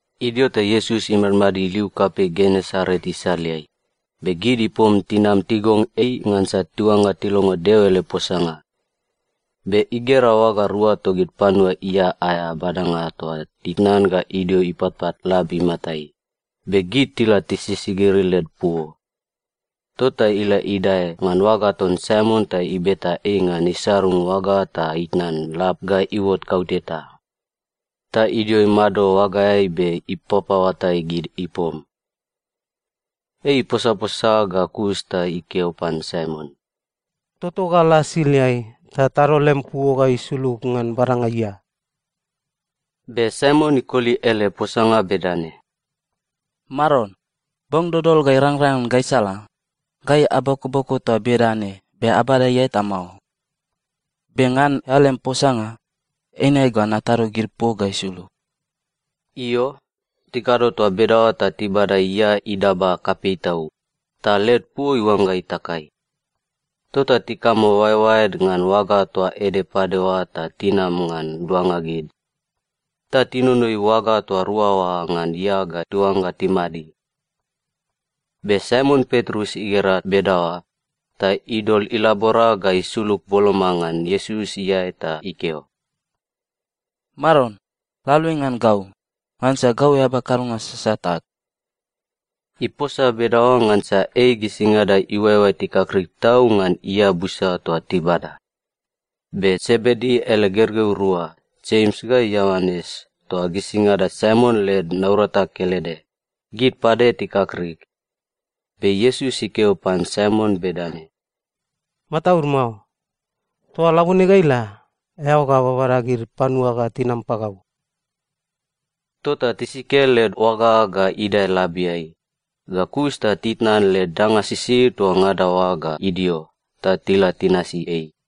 Idio ta Iesus imadmadid liu kapei Genesaret isaleai, be gid ipom tinam tigong ei ngansa tiuangga tilongo Deo ele posanga. Be igera oaga rua togid panua ia aea badanga toa titnan ga idio ipatpat lab imatai, be gid tila tisisigiri led puo. Tota ila idae ngan oaga ton Saimon ta ibeta ei ngan isarung oaga ta itnan lab ga iuot kauteta. Ta idio imado oagaeai be ipapaoatai gid ipom. Ei iposaposa ga kus ta ikeo pan Saimon, “Toto ga la siliai, ta atado lemi puo ga isulug ngan badanga ia.” Be Saimon ikoli ele posanga bedane, “Maron, bong dodol ga irangrang ngan gaisala, gai abokoboko toa bedane be abada ia eta mao. Be ngan eao lem posanga, eine ga natado gid puo ga isulug.” Io, tikado toa bedaoa ta tibada ia idaba kapei tau, ta led puo iuangga itakai. Tota tikamo oaeoaed ngan oaga toa ede pade oa ta tinam ngan luanga gid. Ta tinonoi oaga toa rua oa ngan ia ga tiuangga timadi. Be Saimon Petrus igera bedaoa, ta idol ilabora ga isulug boloma ngan Iesus iae ta ikeo, “Maron, la aluai ngan gau, ngansa gau eaba kadonga sasat ag.” Iposa bedaoa ngansa ei gisingada iuaeoae tikakrik tau ngan ia busa toa tibada. Be Sebedi ele gergeu rua, Jems ga Ioanes toa gisingada Saimon led naurata kelede, gid pade tikakrik. Be Iesus ikeo pan Saimon bedane, “Mataud mao. Toa labone ga ila, eao ga babada gid panua ga tinam pagau.” Tota tisike led oaga ga idae labiai, ga kus ta titnan led danga sisid toa ngada oa ga idio, ta tila tinasi ei.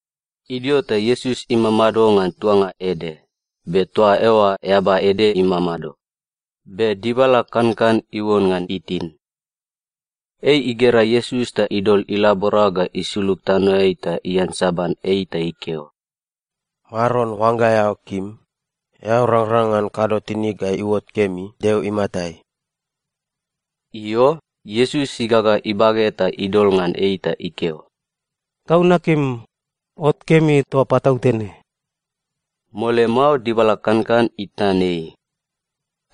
Idio ta Iesus imamado ngan tuanga ede, be toa eoa eaba ede imamado, be dibala kankan iuon ngan itin. Ei igera Iesus ta idol ilabora ga isulug tanoeai ta iansaban ei ta ikeo, “Maron, oangga eao kim, eao rangrang ngan kado tinig ga iuot kemi Deo imatai.” Io, Iesus igaga ibage ta idol ngan ei ta ikeo, “Gau nakim. Ot kemi toa patautene.” Mole mao dibala kankan itnan ei.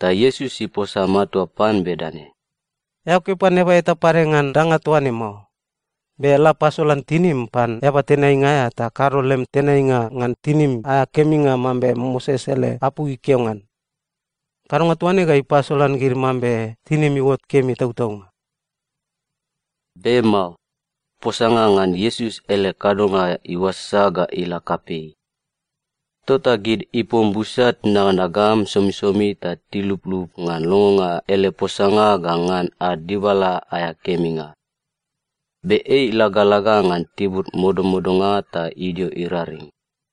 Ta Iesus iposa matua pan bedane, “Eao keo pan eaba eta pade ngan danga toa ne mao. Be la pasolan tinim pan eaba tenainga aea ta kado lem tenainga ngan tinim aea keminga mambe Moses ele apu ikeo ngan. Kadonga toa ne ga ipasolan gid mambe tinim iuot kemi tautaunga.” Be mao, posanga ngan Iesus ele kadonga iuasasa ga ila kapei. Tota gid ipom busa tinaganagam somisomi ta tiluplup ngan longonga ele posanga ga ngan ad dibala aea keminga. Be ei ilagalaga ngan tibur modamodanga ta idio iraring.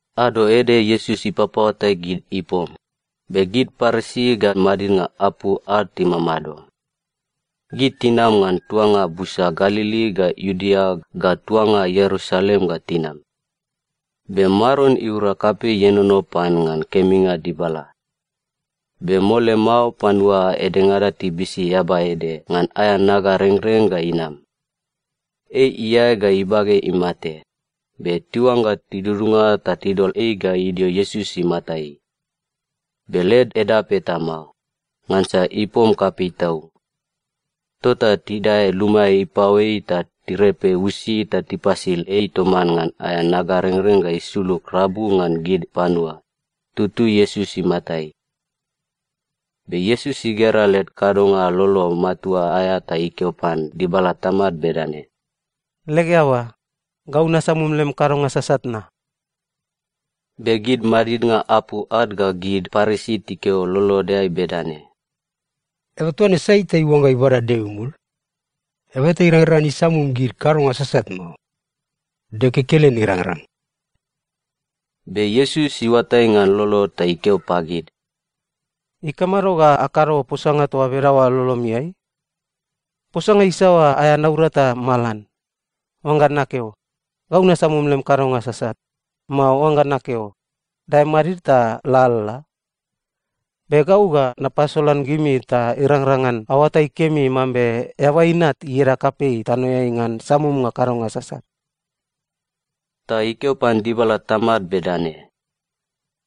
Ado ede Iesus ipapaoatai gid ipom, be gid Parisi ga madidnga apu ad timamado. Gid tinam ngan tuanga busa Galili ga Iudea ga tuanga Ierusalem ga tinam. Be Maron iura kapei ienono pan ngan keminga dibala. Be mole mao panua edengada tibisi eaba ede ngan aea nagarengreng ga inam. Ei iae ga ibage imate, be tiuangga tidudunga ta tidol ei ga idio Iesus imatai. Be led edap eta mao, ngansa ipom kapei tau. Tota tidae luma ipaoeai ta tirepe usi ta tipasil ei toman ngan aea nagarengreng ga isulug rabu ngan gid panua, tutui Iesus imatai. Be Iesus igera led kadonga lolo matua aea ta ikeo pan dibala tamad bedane, “Leg eaba, gau nasamum lem kadonga sasat na.” Be gid madidnga apu ad ga gid Parisi tikeo lolodeai bedane, “Eaba toa ne sai ta iuangga ibada Deo imul? Eaba eta irangrang ngan isamum gid kadonga sasat mao. Deo kekelen irangrang!” Be Iesus iuatai ngan lolod ta ikeo pagid, “Ikamado ga akado posanga toa bedaoa lolomiai? Posanga isaoa aea naurata malan: Oangga nakeo, ‘Gau nasamum lem kadonga sasat,’ mao oangga nakeo, ‘Dae madid ta lalala’? Be gau ga napasolan gimi ta irangrang ngan aoatai kemi mambe Eaba Inat ieda kapei tanoeai ngan samumnga kadonga sasat.” Ta ikeo pan dibala tamad bedane,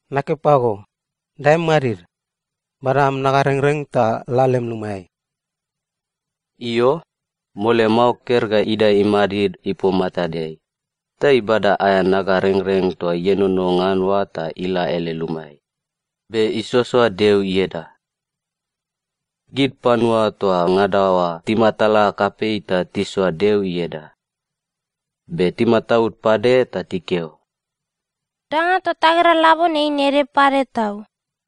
“Nakeo pago, dae madid, bada am nagarengreng ta la lem lumaeai.” Io, mole mao ker ga idae imadid ipom matadeai, ta ibada aea nagarengreng toa ienono ngan oa ta ila ele lumaeai, be isoasoa Deo ieda. Gid panua toa ngada oa timatala kapei ta tisoa Deo ieda. Be timataud pade ta tikeo, “Danga toa tagera labone eine ede pade tau!”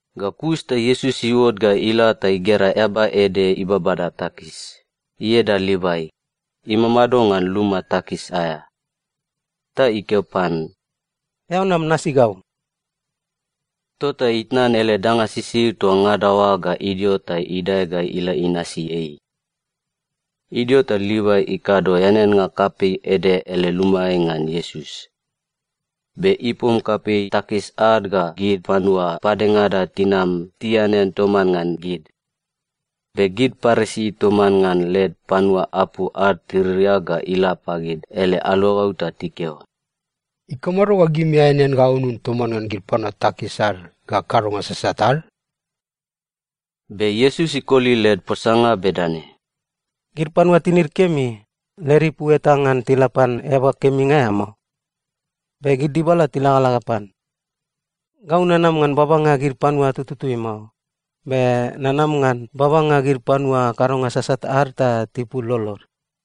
Ga kus ta Iesus iuot ga ila ta igera eaba ede ibabada takis, ieda Livai, imamado ngan luma takis aea. Ta ikeo pan, “Eao nam nasi gau.” Tota itnan ele danga sisid toa ngada oa ga idio ta idae ga ila inasi ei. Idio ta Livai ikado eaneannga kapei ede ele lumaeai ngan Iesus. Be ipom kapei takis ad ga gid panua padengada tinam tianean toman ngan gid. Be gid Parisi toman ngan led panua apu ad tiririak ga ila pagid ele aluagau ta tikeo, “Ikamado ga gimi aeanean ga aunun toman ngan gid panua takis ad ga kadonga sasat ad?” Be Iesus ikoli led posanga bedane, “Gid panua tinid kemi, led ipu eta ngan tila pan eaba keminga aea mao. Be gid dibala tilagalaga pan. Gau nanam ngan babanga gid panua tututui mao, be nanam ngan babanga gid panua kadonga sasat ad ta tipul lolod.”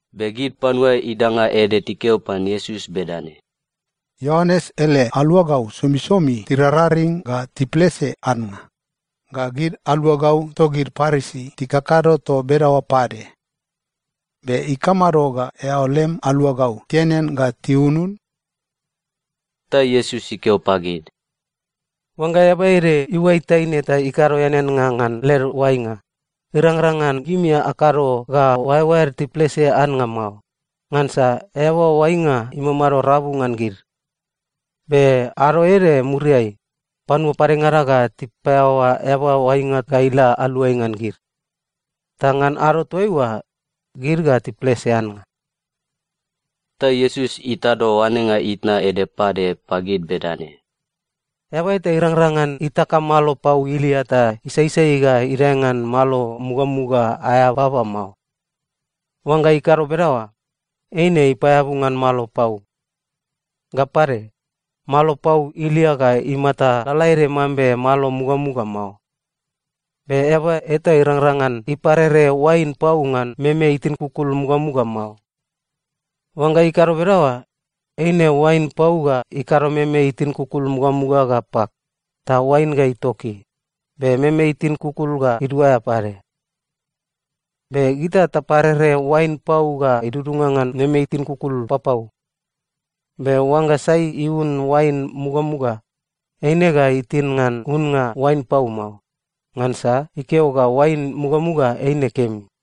Be gid panua idanga ede tikeo pan Iesus bedane, “Ioanes ele aluagau somisomi tirararing ga tiplese annga, ga gid aluagau togid Parisi tikakado toa bedaoa pade. Be ikamado ga eao lem aluagau tianean ga tiunun?” Ta Iesus ikeo pagid, “Oangga eaba ede iuai taine ta tikado eaneannga ngan led oainga, irangrang ngan gimi akado ga oaeoaed tiplese annga mao, ngansa eaba oainga imamado rabu ngan gid. Be ado ede muriai, panua padengada ga tipaeaoa eaba oainga ga ila aluai ngan gid. Ta ngan ado toaiua, gid ga tiplese annga.” Ta Iesus itado oanenga itna ede pade pagid bedane, “Eaba eta irangrang ngan itaka malo pau ilia ta isaisai ga idae ngan malo mugamuga aea baba mao. Oangga ikado bedaoa, eine ipaeabu ngan malo pau. Ga pade, malo pau ilia ga imata lalaede mambe malo mugamuga mao. Be eaba eta irangrang ngan iparere oain pau ngan meme itin kukul mugamuga mao. Oangga ikado bedaoa, eine oain pau ga ikado meme itin kukul mugamuga ga pak, ta oain ga itoki, be meme itin kukul ga iduaea pade. Be gita taparere oain pau ga idudunga ngan meme itin kukul papau. Be oangga sai iun oain mugamuga, eine ga itin ngan unnga oain pau mao, ngansa ikeo ga oain mugamuga eine kemi.”